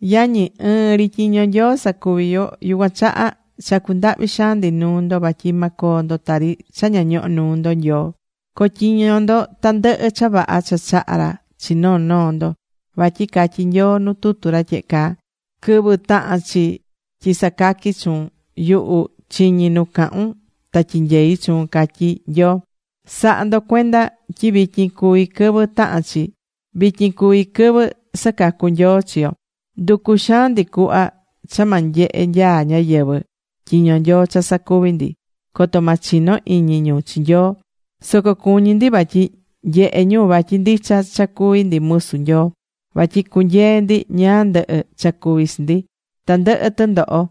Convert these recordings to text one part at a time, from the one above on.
Yañi, ɨɨn ri tyiño Nyoo sacuví yo. Yucuan chaha chacú ndahvi xaan ndi nuu ndo vatyi ma coo ndo tari cha ña ñohó nuu ndo Nyoo. Co̱tyiño ndo tandɨhɨ cha vaha cha chahá ra chi noo noo ndo. Vatyi catyí Nyoo nu tutu tyehe caa: Quɨvɨ taha̱n chi tyi sacaqui chuun, yuhu chiñi̱ nu cahun ta tyinyei̱ chuun, catyí Nyoo. Sa̱ha ndo cuenda tyi vityin cuví quɨvɨ tahán chi. Vityin cuví quɨvɨ sacacú Nyoo chi yo. Nducú xaan ndi cuhva cha ma nyehe nyaa ñáyɨvɨ tyiño Nyoo cha sacuví ndi, coto ma chino iñi ñu chi Nyoo. Soco cuñí ndi vatyi nyehé ñu vatyi ndicha cha cuví ndi musu Nyoo vatyi cunyeé ndi ñáá ndɨhɨ cha cuví chi ndi, tandɨhɨ tɨndoho,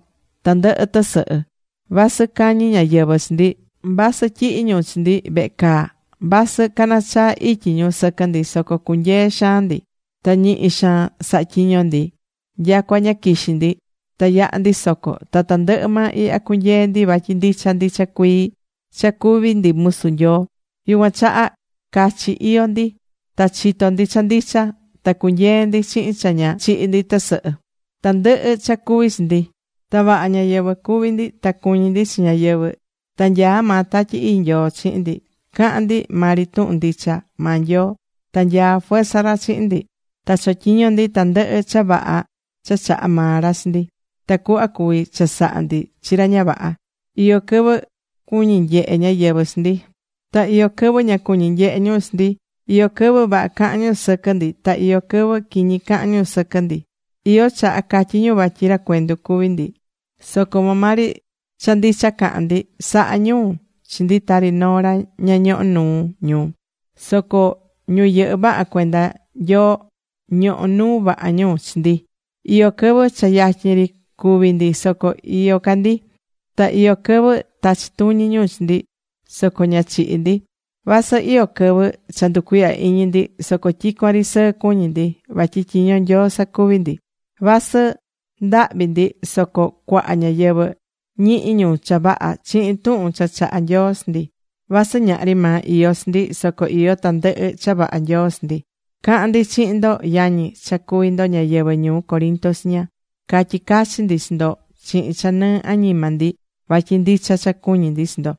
tandɨhɨ tɨsɨhɨ. Vasɨ cañí ñáyɨvɨ chi ndi, vasɨ tyihí ñu chi ndi vehe caa, vasɨ canachaá ityi ñu sɨquɨ ndi, soco cunyeé xaan ndi. Ta ñihi xaan sahá tyiño ndi nyacua ña quixí ndi. Ta yahá ndi soco. Ta tandɨhɨ maa ihya cunyeé ndi vatyi ndicha ndicha cuii cha cuví ndi musu Nyoo. Yucuan chaha cachi iyó ndi. Ta chitó ndi cha ndicha. Ta cunyeé ndi chihin cha ña chihí ndi tɨsɨhɨ tandɨhɨ cha cuví chi ndi. Ta vaha ñáyɨvɨ cuví ndi. Ta cuñí ndi chi ñáyɨvɨ. Ta nyaá maa Tatyi Ii Nyoo chihin ndi. Cahán ndi maa ri tuhun ndicha maa Nyoo. Ta nyaá fuerza ra chihin ndi. Ta chotyiñó ndi tandɨhɨ cha vaha cha chahá maa ra chi ndi, tacuhva cuví chasaha ndi chi ra ña vaha. Iyó quɨvɨ cuñí nyehe ñáyɨvɨ chi ndi. Ta iyó quɨvɨ ña cuñí nyehe ñu chi ndi. Iyó quɨvɨ vaha cahán ñu sɨquɨ ndi. Ta iyó quɨvɨ quiñi cahán ñu sɨquɨ ndi. Iyó chaha catyí ñu vatyi ra cuendu cuví ndi. Soco maa maa ri cha ndicha cahán ndi. Sahá ñu chi ndi tari noo ra ña ñohó nuu ñu. Soco ñu yɨhɨ́ vaha cuenda Nyoo ñohó nuu vaha ñu chi ndi. Iyó quɨvɨ cha yatyin ri cúvi ndi, soco iyó ca ndi. Ta iyó quɨvɨ tachí tuñi ñu chi ndi, soco ña chihí ndi. Vasɨ iyó quɨvɨ cha nducuihyá iñi ndi, soco tyicuan ri sɨɨ cuñí ndi. Vatyi tyiño Nyoo sacuví ndi. Vasɨ ndahvi ndi, soco cuaha ñáyɨvɨ ñihi ñu cha vaha chihin tuhun cha chahá Nyoo chi ndi. Vasɨ ñahri maa iyó chi ndi, soco iyó tandɨhɨ cha vaha Nyoo chi ndi. Cahán ndi chihin ndo yañi, cha cuví ndo ñáyɨvɨ ñuu Corinto chiña. Catyí cachi ndi chi ndo chihin cha nɨɨ añima ndi vatyi ndicha cha cuñí ndi chi ndo.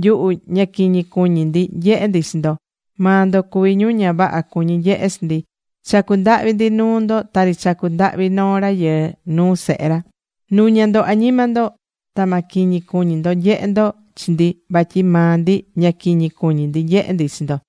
Nyuhu, ña quiñi cuñi ndi nyehe ndi chi ndo. Maa ndo cuví ñu ña vaha cuñí nyehe chi ndi. Chacú ndahvi ndi nuu ndo tari chacú ndahvi noo rayɨɨ nuu sehe ra, nu̱ña ndo añima ndo, ta ma quiñi cuñí ndo nyehe ndo chi ndi, vatyi maa ndi ña quiñi cuñí ndi nyehé ndi chi ndo.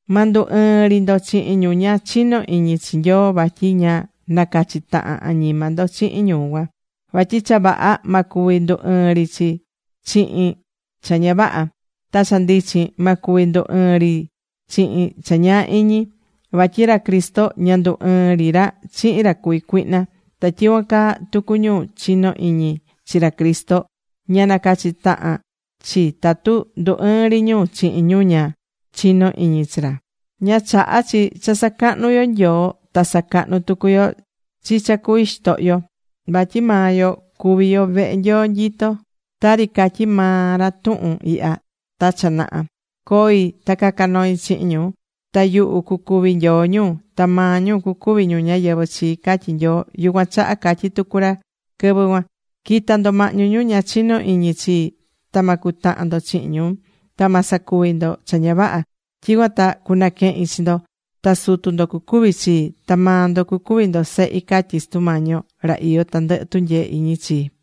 Ma ndu ɨɨn ri ndo chihin ñu ña chinó iñi chi Nyoo. Vatyi ña nacachí tahan añima ndo chihin ñu cuan. Vatyi cha vaha ma cuvi ndu ɨɨn ri chihin cha ña vaha. Ta cha ndichin ma cuvi ndu ɨɨn ri chihin cha ñaa iñi. Vatyi ra Cristo ña ndu ɨɨn ri ra chihin ra cuví cuihna. Ta tyicuan caa tucu ñu chinó iñi chi ra Cristo, ña nacachí tahan chi tatu ndu ɨɨn ri ñu chihin ñu ña chinó iñi chi ra. Ña chahá chi cha sacahnú yo Nyoo ta sacahnú tucu yo chi cha cuví xitohyo. Vatyi maa yo cuví yo vehe Nyoo nyitó. Tari catyi̱ maa ra tuhun ihya ta cha naha: Coi ta caca noi chihin ñu. Ta yuhu cucuvi Nyoo ñu, ta maa ñu cucuvi ñu ñáyɨvɨ chii, catyi̱ Nyoo. Yucuan chaha catyi̱ tucu ra quɨvɨ cuan: Qui̱ta ndo mahñu ñu ña chinó iñi chii. Ta ma cutahan ndo chihin ñu. Ta ma sacuvi ndo cha ña vaha. Tyicuan ta cunaquehin chi ndo. Ta sutu ndo cucuvi chii. Ta maa ndo cucuvi ndo sehi, catyi̱ Sutu Mañi yo, ra iyó tandɨhɨ tunyee iñi chii.